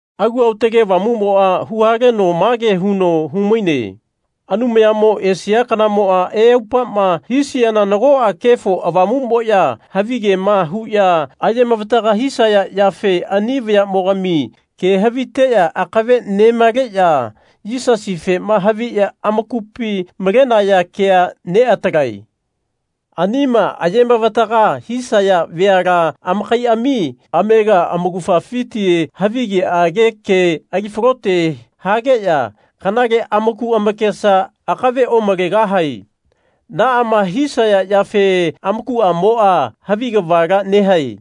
Alu Aotage Avamumoa huhaleno mage huno humaine Anumayamo esia kanamoa eaupama hisiana nagoa Kefo Avamumoya havigema huya ayemavataga hisaya yafe ani vayamogami ke haviteya akave nemaleya Yisasifema haviya amakupi malenaya kea neatalae. Anima ayemavataga hisaya veala amakaiami amega amaugafafiti havigeage ke ali falote hageya kanale amaku amakesa akave omalegahae. Naama hisaya yafe amakuamoa Havi kavala nehae.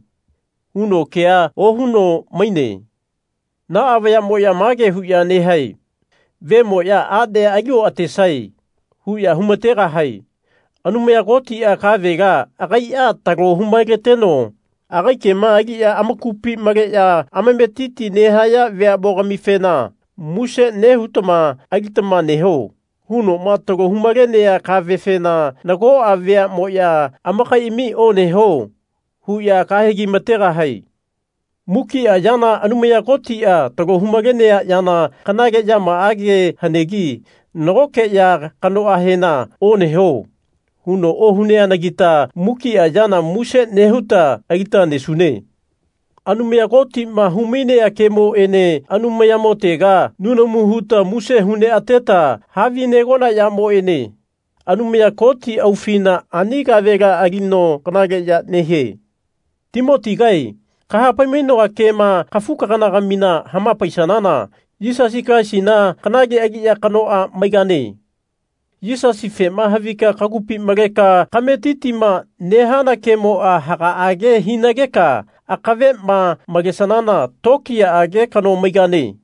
huno kea ohuno maine. Naa vayamoya mage huya nehae Vemoya anea ali oatesae. huya humategahae. Anumaya Kotia kavela agaia talo humaleteno agai kema aliya amakupi maleya amametiti nehaya veamogamifena Muse nehutama alitama neho. hunoma talo humalenea kavefena nagoa veamoya amakaiami Oneho. huya kahegi-mategahae. Mukia yana Anumaya Kotia talo hu-malenea yana kanale yamaage hanegi nagoke ya kanoahena Oneho. huno ohuneanagita mukia yana muse nehuta alita nesune. Anumaya Kotima humainea kemoene Anumayamotega nunamu huta muse hu neateta havinegona yamoene Anumaya Koti aufina ani kavela alino kanaleya nehie. Timotigae kahapai-mainoa kema kafu-kagana-gamina hamapaisanana Yisasi Kalaisina kanale aliya kanoa maigane. Yisasifema havika kagupi maleka kametitima nehana kemoa hagaage hinageka akavema malesanana tokiyaage kano maigane.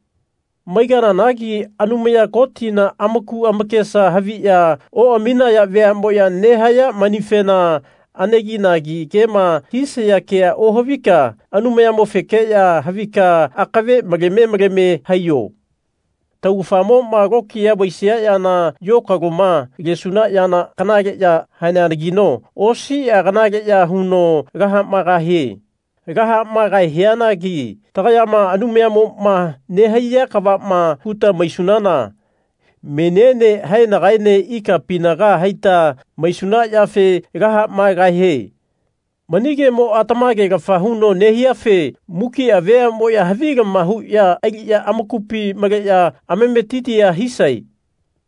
Maigananagi Anumaya Kotina amaku amakesa haviya oaminaya veamoya nehaya manifena aneginagi kema hisaya kea ohavika Anumayamofekeya havika akave maleme maleme haiyo. Taugafamoma tokiya vaisia yana yokaloma lesuna yana kanale ya haneanagino osia kanaleya huno lahamaegahie. Lahamaegahianagi tagayama Anumayamoma nehaiya kavama huta maisunana meniene haenagaene ikapinaga haita maisuna yafe lahamaegahie. Mani kemoa tamagelafa huno nehiafe mukia veamoya havilama huya aliya amakupi maleya amametitia hisae.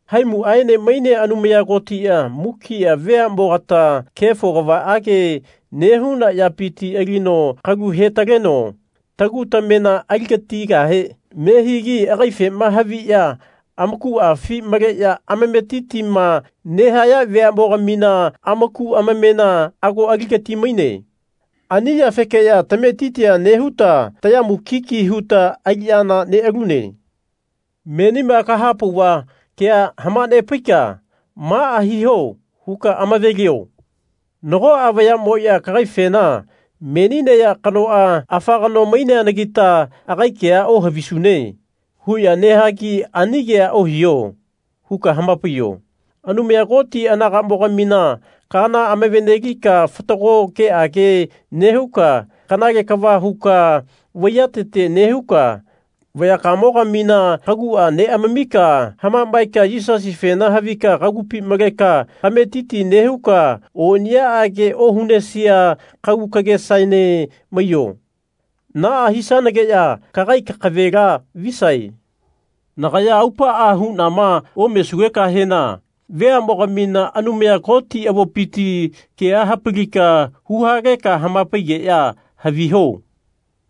Haimuaene mainea Anumaya Kotia mukia veamogata kefo kavaage nehuna yapiti alino kalu hetaleno tagu tamena aligatigahe nehigi agaifema haviya amakuafi maleya amametitima nehaya veamogamina amaku amamena ago aligati-maine. Ani yafekeya tametitia nehuta taya mukiki huta aliyana nealune. Menima kahapauva kea hamanepaika Maa hiho. huka amavelio. Nagoa vayamoya kagaifena Meni neya kanoa, afa kano maineanagita agai kea ohavisune. huya nahagi Ani kea ohiho. huka hamapaiyo. Anumaya Koti anagamogamina kaana amavene-lika fatago keage nehuka kanale kava huka vaiyatete nehuka vayakamogamina kagua neamamika hamamaeka Yisasifena havika kagupi maleka kametiti nehuka oniyaage ohunesia kagu kagesaene maiyo. Naa hisanageya kagai kakavela visae. Nagaya aupaa hunama omesugekahena veamogamina Anumaya Koti avopiti kea hapalika hu haleka hamapaigeya haviho.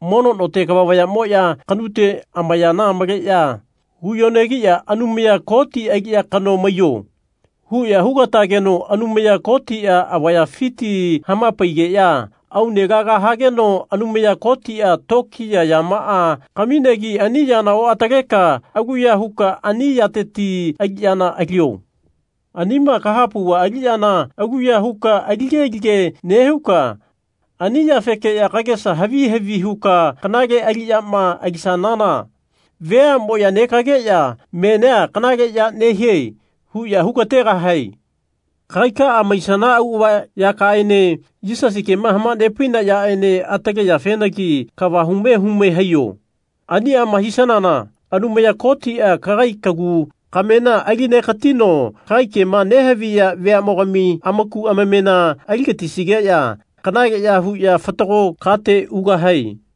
Mono note kava vayamoya kanute amayana maleya huyonegiya Anumaya Koti aliya kano maiyo. huya hugatageno Anumaya Kotia avayafiti hamapaigeya aune laga hageno Anumaya Kotia tokiya yamaa kaminegi ani yana oataleka aluya huka ani yateti aliyana alio. Anima kahapauva aliyana aluya huka alige-lige nehuka ani yafeke kagesa havi havi huka kanale aliyama alisanana veamoya negageya Menia kanale ya nehie. huya hugategahae. Kagaikaa maisana auava yakaaene Yisasi kema hamanepaina yaene atale yafenagi kava hume hume haiyo. Aniama hisanana Anumaya Kotia kagai kagu kamena alinegatino kagai kema nehaviya veamogami amaku amamena aligatisigeya kanaleya huya fatago kate ugahae.